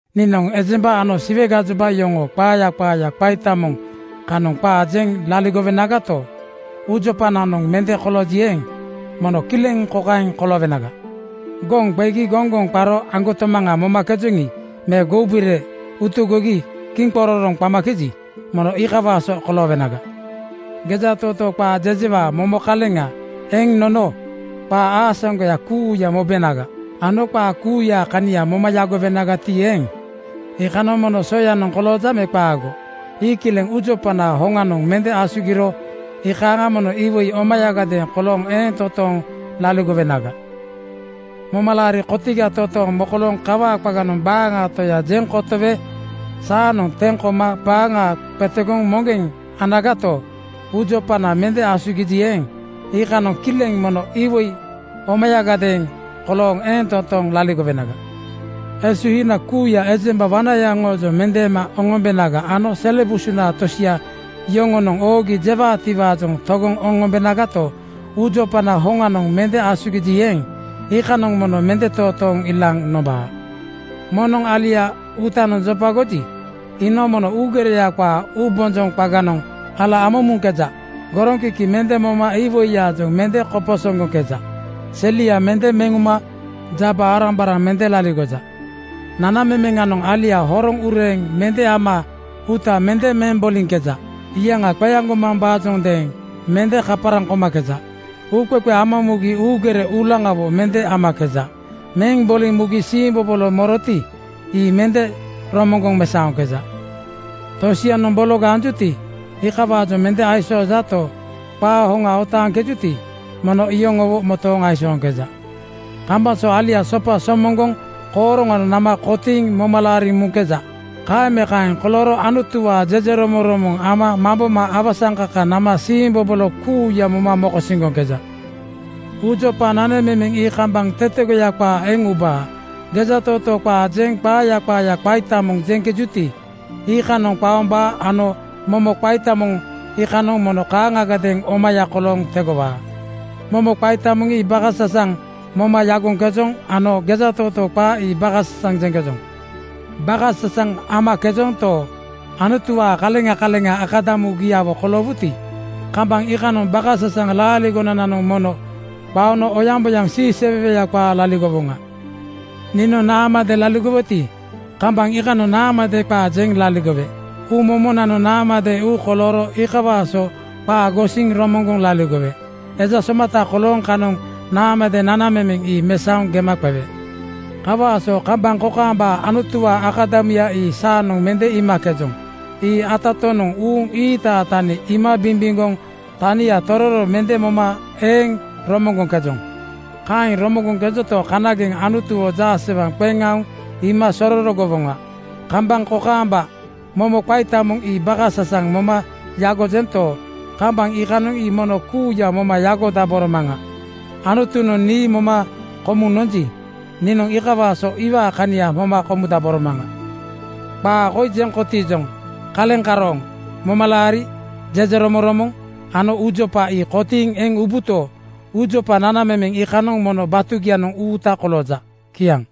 Niinoŋ ejemba ano Siwe gajoba yoŋoo qaaya qaaya qaita moŋ kanoŋ qaa jeŋ laligowenagato, uujopananoŋ mende kolooji eeŋ, mono kileŋ kokaeŋ koloowenaga: Goŋ qegi goŋgoŋ qaro aŋgotomaŋa momakejoŋi me goubire utugogi kiŋqororoŋ qamakeji, mono iikawaa so koloowenaga. Gejatootoo qaa jejewaa momo kaleŋa eŋ nono qaa aasaŋgoya kuuya mobenaga ano qaa kuuyaa kania moma yagowenagati eeŋ, iikanoŋ mono soyanoŋ kolooja me qaago? Ii kileŋ uujopanaa hoŋanoŋ mende asugiro iikaaŋa mono iwoi omayagadeeŋ kolooŋ eeŋ totooŋ laligowenaga. Momalaari kotiga totooŋ mokolooŋ kawaa qaganoŋ baaŋaa Toya jeŋ kotowe saanoŋ teŋ koma baaŋa qetegoŋ moŋgeŋ anagato, uujopana mende asugiji eeŋ, iikanoŋ kileŋ mono iwoi omayagadeeŋ kolooŋ eeŋ totooŋ laligowenaga. Esuhinana kuuya ejemba wanaya yoŋoojoŋ mendeema oŋombenaga ano sele busuna tosia yoŋonoŋ oogi jewaatiwaajoŋ togoŋ oŋombenagato, uujopanaa hoŋanoŋ mende asugiji eeŋ, iikanoŋ mono mende totooŋ ilaaŋ nombaa. Moŋnoŋ alia uutanoŋ jopagoji, iinoŋ mono uugereya qaa uubonjoŋ qaganoŋ ala ama muŋkeja. Goroŋkiki mende moma iwoiyaajoŋ mende koposoŋgoŋkeja. Selia mende meŋ uma jaba-arambaraŋ mende laligoja. Nanamemeŋanoŋ alia horoŋ ureeŋ mende ama uuta mende meŋ boliŋkeja. Iyaŋa qeaŋgomambaajondeeŋ mende kaparaŋ komakeja. Uuqeqe ama mugi uu uugere uulaŋawo mende amakeja. Meŋ boliŋ mugi siimbobolo moroti, ii mende romoŋgoŋ mesaoŋkeja. Tosianoŋ bologa anjuti, iikawaajoŋ mende aisoojato, qaa hoŋa otaaŋkejuti, mono iyoŋowo motooŋ aisooŋkeja. Kambaŋ so alia sopa somoŋgoŋ kooroŋanoŋ nama kotiiŋ moma laariŋ muŋkeja. Kaeŋ me kaeŋ kolooro Anutuwaa jejeromoŋromoŋ ama mamboma awasaŋkaka nama siimbobolo kuuya moma mokosiŋgoŋkeja. Uujopa nanamemeŋ ii kambaŋ tetegoya qaa eŋ ubaa. Gejatootoo qaa jeŋ qaaya qaaya qaita moŋ jeŋkejuti, iikanoŋ qaombaa ano momo qaita moŋ iikanoŋ mono kaaŋagadeeŋ omaya kolooŋ tegowaa. Momo qaita moŋ ii bakasasaŋ moma yagoŋkejoŋ ano gejatootoo qaa ii bakasasaŋ jeŋkejoŋ. Bakasasaŋ amakejonto, Anutuwaa kaleŋa kaleŋa akadamugiawo koloowuti, kambaŋ iikanoŋ bakasasaŋ laaligonananoŋ mono qaono oyaŋboyaŋ siiseweweya qaa laligowoŋa. Niinoŋ naamade laligoweti, kambaŋ iikanoŋ naamade qaa jeŋ laligowe. Uumomonanoŋ naamade uu kolooro iikawaa so qaa gosiŋ romoŋgoŋ laligowe. Eja somata kolooŋ kanoŋ naamade nanamemeŋ ii mesaoŋ gema qewe. Kawaa so kambaŋ kokaamba Anutuwaa akadamuya ii saanoŋ mende iimakejoŋ. Ii atatonoŋ uuŋ ii-iitaa tani iima bimbimgoŋ tania tororo mende moma eeŋ romoŋgoŋkejoŋ. Kaeŋ romoŋgoŋkejonto, kanageŋ Anutuwo jaasewaŋ qeŋ aoŋ iima sororogowoŋa. Kambaŋ kokaamba momo qaita moŋ ii bakasasaŋ moma yagojento, kambaŋ iikanoŋ ii mono kuuya moma yagodaboro maŋa. Anutunoŋ nii moma komuŋ nonji, niinoŋ iikawaa so iwaa kania moma komudaboro maŋa. Qaa koi jeŋ kotiijoŋ: Kaleŋ karooŋ momalaari, jejeromoŋromoŋ ano uujopa ii kotiiŋ eŋ ubuto, uujopa nanamemeŋ iikanoŋ mono batugianoŋ uuta kolooja. Kiaŋ.